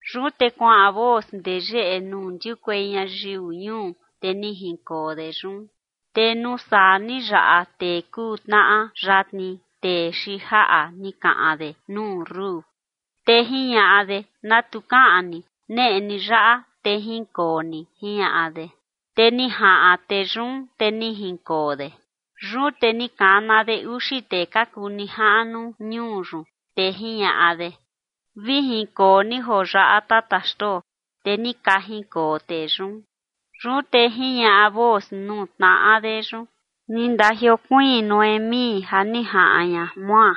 Yun te kuaꞌan Booz ndee yeꞌe nuu ndiukuei ñayiu ñuu, te ni jinkoo de yun. Te nuu saa ni yaꞌa tee kuu tnaꞌa yatni, tee xiin jaꞌa ni kaꞌan de nuu Rut, te jiñaꞌa de: ―¿Na tu kaꞌan ni? Neꞌe ni yaꞌa, te jinkoo ni ―jiñaꞌa de. Te ni jaꞌan tee yun, te ni jinkoo de. Yun te ni kana de uxi tee ka kuu nijaꞌnu ñuu yun, te jiñaꞌa de: ―Vi jinkoo ni joo yaꞌa, tata xtoo. Te ni ka jinkoo tee yun. Yun te jiñaꞌa Booz nuu tnaꞌa de yun: ―Ni ndajiokuiin Noemí ja ni jaꞌan ña Moab,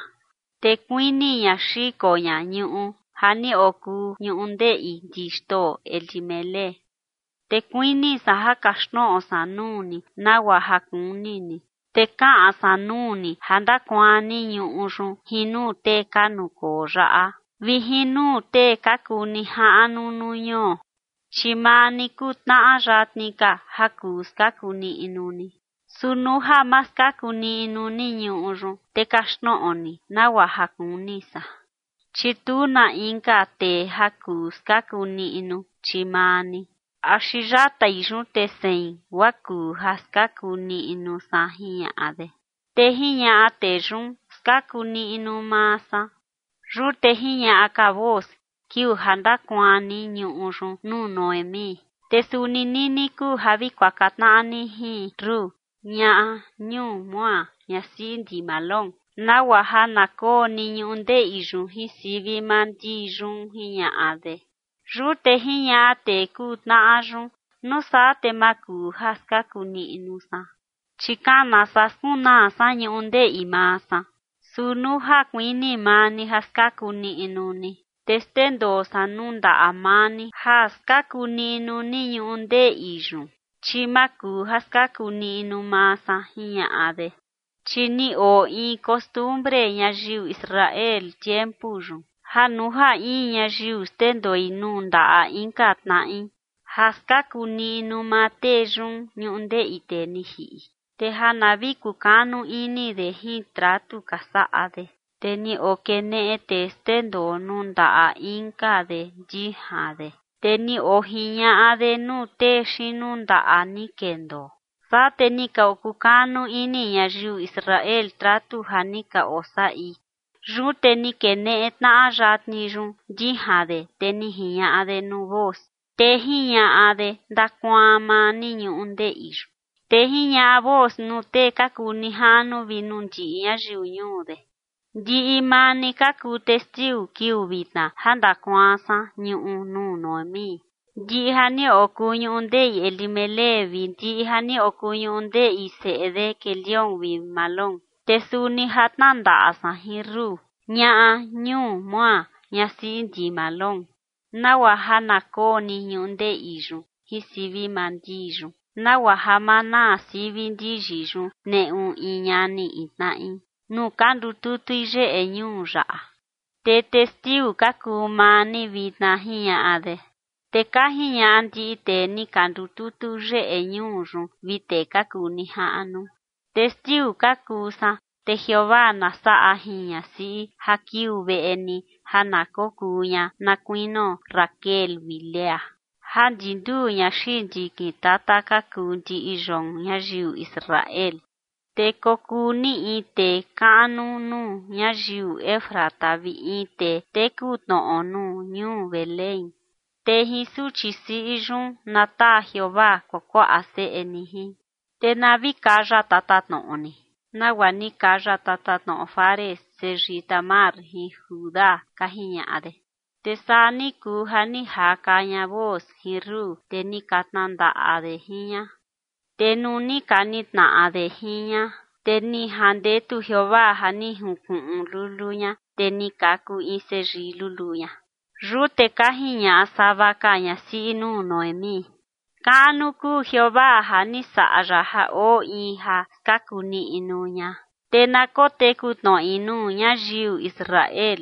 te kuini ña xiko ña ñuꞌu ja ni okuu ñundeꞌi ndi xtoo Elimelec. Te kuini san ja kaxtnoꞌo san nuu ni nagua ja kuni ni, te kaꞌan san nuu ni ja ndakuaan ni ñuꞌu yun jin nuu tee ka nukoo yaꞌa vi jin nuu tee ka kuu nijaꞌnu nuu ñuo. Chi maa ni kuu tnaꞌa yatni ka ja kuu skaku niꞌnu ni. Su nuu ja ma skaku niꞌnu ni ñuꞌu yun, te kaxtnoꞌo ni nagua ja kuni san, chi tu na inka tee ja kuu skaku niꞌnu, chi maa ni, axi yatai yun te sein guaa kuu ja skaku niꞌnu san ―jiñaꞌa de. Te jiñaꞌa tee yun: ―Skaku niꞌnu maa san. Yun te jiñaꞌa ka Booz: ―Kiuu ja ndakuaan ni ñuꞌu yun nuu Noemí, te suni nini kuu ja vi kuaka tnaꞌa ni jin Rut, ñaꞌa ñuu Moab, ñasiꞌi ndi Mahlón, nagua ja na koo ni ñundeꞌi yun jin sivi maa ndi yun ―jiñaꞌa de. Yun te jiñaꞌa tee kuu tnaꞌa yun: ―Nuu saa te ma kuu ja skaku niꞌnu san, chi kana saa skunaa san ñundeꞌi maa san. Su nuu ja kuini maa ni ja skaku niꞌnu ni, te xndendoo san nuu ndaꞌa maa ni ja skaku niꞌnu ni ñundeꞌi yun, chi ma kuu ja skaku niꞌnu maa san ―jiñaꞌa de. Chi ni oo in costumbre ñayiu Israel tiempu yun, ja nuu ja in ñayiu xndendoi nuu ndaꞌa inka tnaꞌi ja skaku niꞌnu maa tee yun ñundeꞌi tee ni jiꞌi, te ja na vi kukanu ini de jin tratu ka saꞌa de. Te ni okeneꞌe tee xndendoo nuu ndaꞌa inka de ndijan de, te ni ojiñaꞌa de nuu tee xiin nundaꞌa ni kendoo. Saa te ni ka okukanu ini ñayiu Israel tratu ja ni ka osaꞌi. Yun te ni keneꞌe tnaꞌa yatni yun ndijan de, te ni jiñaꞌa de nuu Booz, te jiñaꞌa de: ―Ndakuaan maa ni ñundeꞌi yun. Te jiñaꞌa Booz nuu tee ka kuu nijaꞌnu vi nuu ndiꞌi ñayiu ñuu de: ―Ndiꞌi maa ni ka kuu testiu kiuu vitna ja ndakuaan san ñuꞌu nuu Noemí, ndiꞌi ja ni okuu ñundeꞌi Elimelec vi ndiꞌi ja ni okuu ñundeꞌi seꞌe de Quelión vi Mahlón. Te suni ja tnandaꞌa san jin Rut, ñaꞌa ñuu Moab, ñasiꞌi ndi Mahlón, nagua ja na koo ni ñundeꞌi yun jin sivi maa ndi yun, nagua ja ma naa sivi ndiyi yun neꞌu in ñani in tnaꞌi nuu ka ndututui yeꞌe ñuu yaꞌa. Te testiu ka kuu maa ni vitna ―jiñaꞌa de. Te ka jiñaꞌa ndiꞌi tee ni ka ndututu yeꞌe ñuu yun vi tee ka kuu nijaꞌnu: ―Testiu ka kuu san. Te Jeovaa na saꞌa jin ñasiꞌi ja kiuu veꞌe ni ja na kokuu ña na kuinio Raquel vi Lea ja ndi nduu ña xiin ndikin tata ka kuu ndiꞌi yoon ñayiu Israel, te kokuu ni in tee kaꞌnu nuu ñayiu Efrata, vi in tee teku tnoꞌo nuu ñuu Belén. Te jin suchi siꞌi yun na taa Jeovaa kuakuaꞌa seꞌe ni jin, te na vi kaya tatatnoꞌo ni, nagua ni kaya tatatnoꞌo Fares seyii Tamar jin Judá ―ka jiñaꞌa de. Te saa ni kuu ja ni jaka ña Booz jin Rut, te ni ka tnandaꞌa de jin ña. Te nuu ni ka nitnaꞌa de jin ña, te ni jandetu Jeovaa ja ni junkuꞌun luluu ña, te ni kaku in seyii luluu ña. Yun te ka jiñaꞌa sava ka ñasiꞌi nuu Noemí: ―Kaꞌnu kuu Jeovaa ja ni saꞌa ya ja oo in ja skaku niꞌnu ña, te na koteku tnoꞌi nuu ñayiu Israel.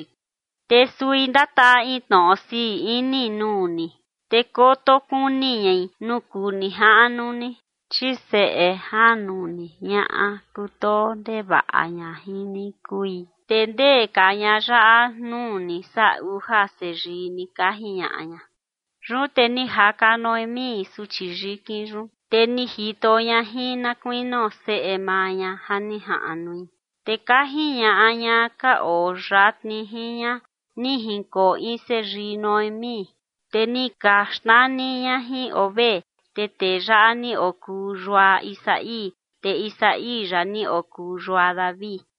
Te sui ndataa in tnoꞌo sii ini nuu ni, te koto kuni ñai nuu kuu nijaꞌnu ni, chi seꞌe janu ni, ñaꞌa kutoo ndevaꞌa ña jin ni kui, te ndee ka ñaꞌa yaꞌa nuu ni saa uja seyii ni ―ka jiñaꞌa ña. Yun te ni jaka Noemí suchi yikin yun, te ni jito ña jin na kuinio seꞌe maa ña ja ni jaꞌnui. Te ka jiñaꞌa ñaꞌa ka oo yatni jin ña: ―Ni jinkoo in seyii Noemí. Te ni ka xnani ña jin Obed. Te tee yaꞌa ni okuu yua Isaí, te Isaí yaꞌa ni okuu yua David.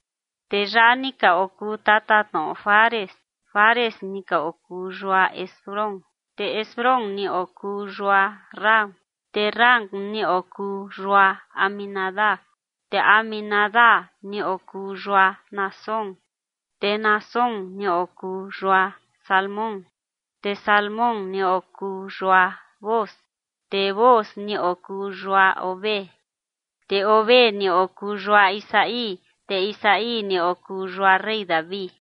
Tee yaꞌa ni ka okuu tatatnoꞌo Fares: Fares ni okuu yua Hezrón, te Hezrón ni okuu yua Ram, te Ram ni okuu yua Aminadab, te Aminadab ni okuu yua Naasón, te Naasón ni okuu yua Salmón, te Salmón ni okuu yua Booz, te Booz ni okuu yua Obed, te Obed ni okuu yua Isaí, te Isaí ni okuu yua rey David.